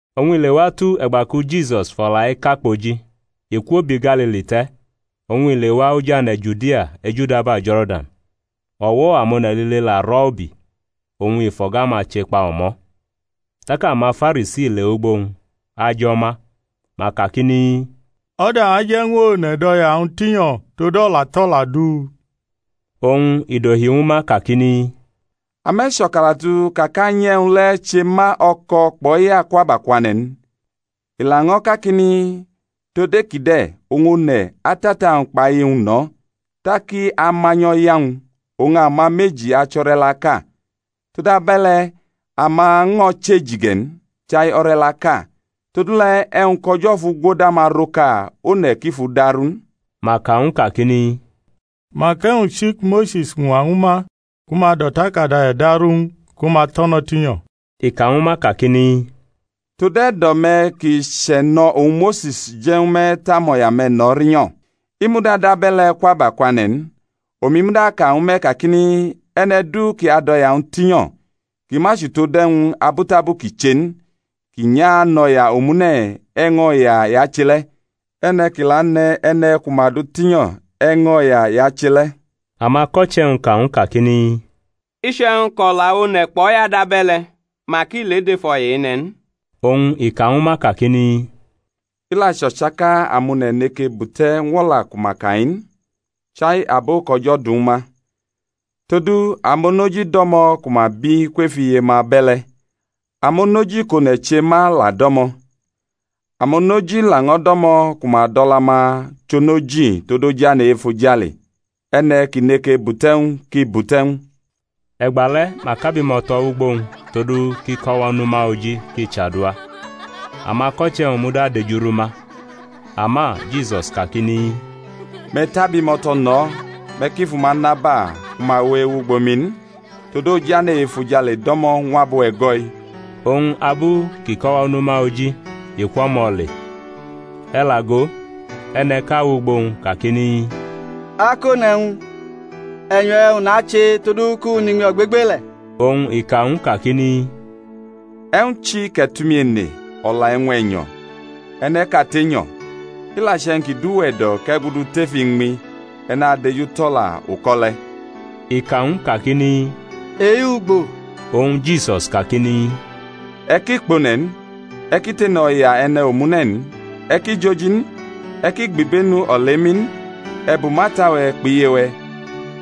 Oñ i lewatu e̩gba ki Jisus fʼo̩la-i ka kpoji i kwo bi Galili te̩, oñ i lewa oj ane̩ Judia ejudaba Jo̩rdan. O̩wo̩ amone̩ lile la rʼo̩ ubi, oñ i fʼo̩ga-ma chekpa o̩mo̩. Tak amaFarisi lewʼugbo-wñ ajʼo ma, ma kakini, O̩da aje̩ ñw one̩ dʼo̩ya-wñ tinyo̩ tod o̩la tʼo̩la du? Oñ i dohi ñwu ma kakini, Ame̩ cho̩kalatu ka kʼAnyi e̩wñ le̩ che ma o̩ko̩ kpʼo̩ya kwʼabakwane̩ n? I laño̩ kakini, Tod e-ki de̩ oñ one̩ atʼata-wñ kpʼiye-wñ no̩, tak i amanyʼo̩ya-wñ. Oñ ama meji achʼo̩re̩laʼka. Tod abe̩le̩ ama ño̩ chʼeji ge̩ n, chai o̩re̩laʼka. Todule̩ e̩wñ kʼO̩jo̩ fugwodama rʼoka, one̩ ki fʼu daru n. Ma ka ñw u kakini, Mak e̩wñ chi ku Mose̩s ñwa ñwu ma ku ma dʼo̩takada e̩daru ñw u ku ma tʼo̩ no̩ tinyo̩? I ka ñwu ma kakini, Tod e̩do̩-me̩ ki chʼe̩no̩ oñ Mose̩s je̩ ñwu me̩ tʼamo̩ya-me̩ no̩ rinyo̩; i muda dʼabe̩le̩ kwʼabakwane̩ n. Omi muda aka ñwu me̩ kakini, E̩ne̩ du kʼi adʼo̩ya-wñ tinyo̩ ki ma chʼutod e̩wñ abutabu kʼi che n, kʼi nyʼanʼo̩ya omune̩, e̩ño̩ya i ache le̩; e̩ne̩ kʼi la ane̩ e̩ne̩ ku ma du tinyo, e̩ño̩ya i ache le̩. Amako̩che̩-wñ ka ñw u kakini, Iche̩wñ kʼo̩la one̩ kpʼo̩ya dabe̩le̩, mak ile dʼef o̩ya ene̩ n. Oñ i ka ñwu ma kakini, I la chʼo̩chaka amone̩ neke bute̩ ñw o̩la ku ma ka-i n, chai abo kʼO̩jo̩ du ñwu ma. Todu amonoji do̩mo̩ ku ma bi kwef iye-ma abe̩le̩; amonoji kʼone̩ che ma la do̩mo̩; amonoji laño̩ do̩mo̩ ku ma dʼo̩la-ma chʼonoji tod ojane̩ e-efojale. E̩ne̩ kʼi neke bute̩ ñw u kʼi bute̩ ñw u. E̩gba le̩ ma kʼabimo̩to̩ wʼugbo-wñ todu kʼi kʼo̩wo̩ nʼuma oji kʼi chadua. Amako̩che̩-wñ muda dejurʼuma. Ama Jisus kakini, Me̩ tʼabimo̩to̩ no̩, me̩ ki fu ma naba ku ma we ewʼugbo mi n; todu ojane̩ e-efojale do̩mo̩ ñw abo e̩go̩-i. Oñ abu kʼi kʼo̩wo̩ nʼuma oji i kwʼo̩mo̩ le. E̩ la go, e̩ne̩ʼka wʼugbo-wñ kakini, Akone̩ e̩wñ, e̩nyo̩ e̩wñ nache todu kʼu nʼiñmi ogbegbele̩? Oñ i ka ñw u kakini, E̩wñ chi kʼe̩ tʼumi ene o̩la e̩wñ e̩nyo̩? E̩ne̩ʼkate nyo̩. I la che̩wñ ki dʼuwe̩ e̩do̩ kʼe̩ gudu tef iñmi, e̩ nadejutʼo̩la uko̩ le̩. I ka ñw u kakini, E-ugbo? Oñ Jisus kakini, E̩ ki kpʼone̩ n; e̩ ki tene o̩ya e̩ne̩ omune̩ n; e̩ ki joji n; e̩ ki gbʼibenu olemi n; i e̩ bumʼata-we̩ kpʼiye-we̩;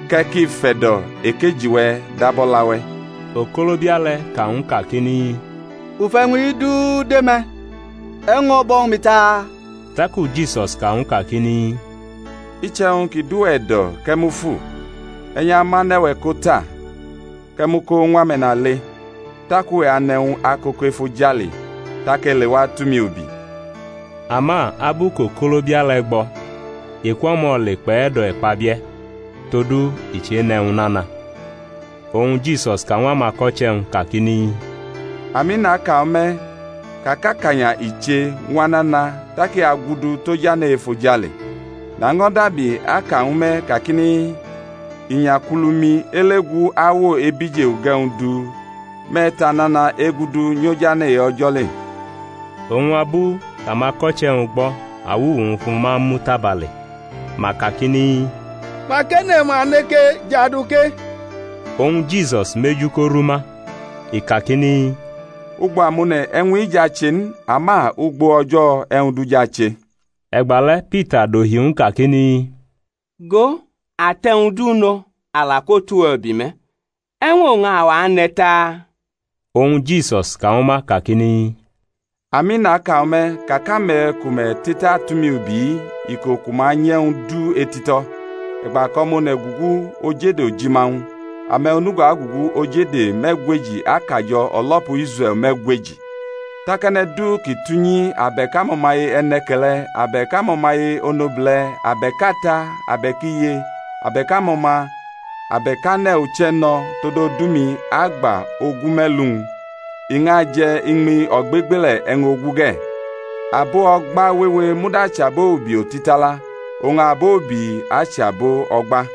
kʼe̩ ki fe̩do̩ ekeji-we̩ dab o̩la-we̩. Okolobia le̩ ka ñw u kakini, U fʼe̩wñ-i du de me̩; e̩wñ ño̩ bo̩ ñwu mi ta? Taku Jisus ka ñw u kakini, Iche̩wñ ki dʼuwe̩ e̩do̩ kʼe̩ mufu, e̩ nyʼamʼane̩-we̩ ko ta, kʼe̩ mʼu ko ñw ame̩nale, tak uwe̩ anʼe̩wñ akoko efojale; tak e̩ lewa tʼumi ubi. Ama abu kʼokolobia le̩ gbo̩, i kwʼo̩mo̩ le kpʼe̩do̩ e̩kpabie̩, todu i chenʼe̩wñ nana. Oñ Jisus ka ñw amako̩che̩-wñ kakini, Ami, naka ñwu me̩, ka kʼakanya i che ñw anana tak i agudu tʼojane̩ e-efojale. Naño̩ dabi aka ñwu me̩ kakini, Inyakulumi ele gu awo ebije uge̩wñ du me̩ tʼanana egudu nyʼojane̩ e-O̩jo̩ le. Oñ abu kʼamako̩che̩ gbo̩ awuwu-wñ fʼuma mu tabale. Ma kakini, Mak e̩ne̩ ma neke jadu ke? Oñ Jisus mʼeju korʼuma, i kakini, Ugbo amone̩ e̩wñ-i jʼache n, ama ugbo O̩jo̩ e̩wʼñ du jʼache. E̩gba le̩ Pita dohi ñw u kakini, Go, a tʼe̩wñ du no̩, a la kwotʼuwe̩ ubi me̩, e̩wñ oñ awa ane̩ taa? Oñ Jisus ka ñwu ma kakini, Ami, naka ñwu me̩, ka kʼame̩ ku me̩ te̩tatʼumi ubi-i, iko ku ma nyʼe̩wñ du etito̩, e̩gba kʼO̩ma One̩ gugu oj ede ojima-wñ, ame̩ onugo agugu oj ede me̩gweji akajo̩ o̩lo̩pu Israe̩l me̩gweji. Tak e̩ne̩ du kʼi tʼunyi abe̩k amo̩maye e̩ne̩ke̩le̩ abe̩k amo̩maye onobule̩ abe̩k ata abe̩k iye abe̩k amo̩ma abe̩k ane̩ uche̩ no̩ tod odu-mi agba ogume̩lu-wñ i ñʼaje̩ iñmi ogbegbele̩ e̩wñ ogu ge̩. Abo o̩gba wewe muda achʼabo ubi otitala, oñ abo ubi achʼabo o̩gba.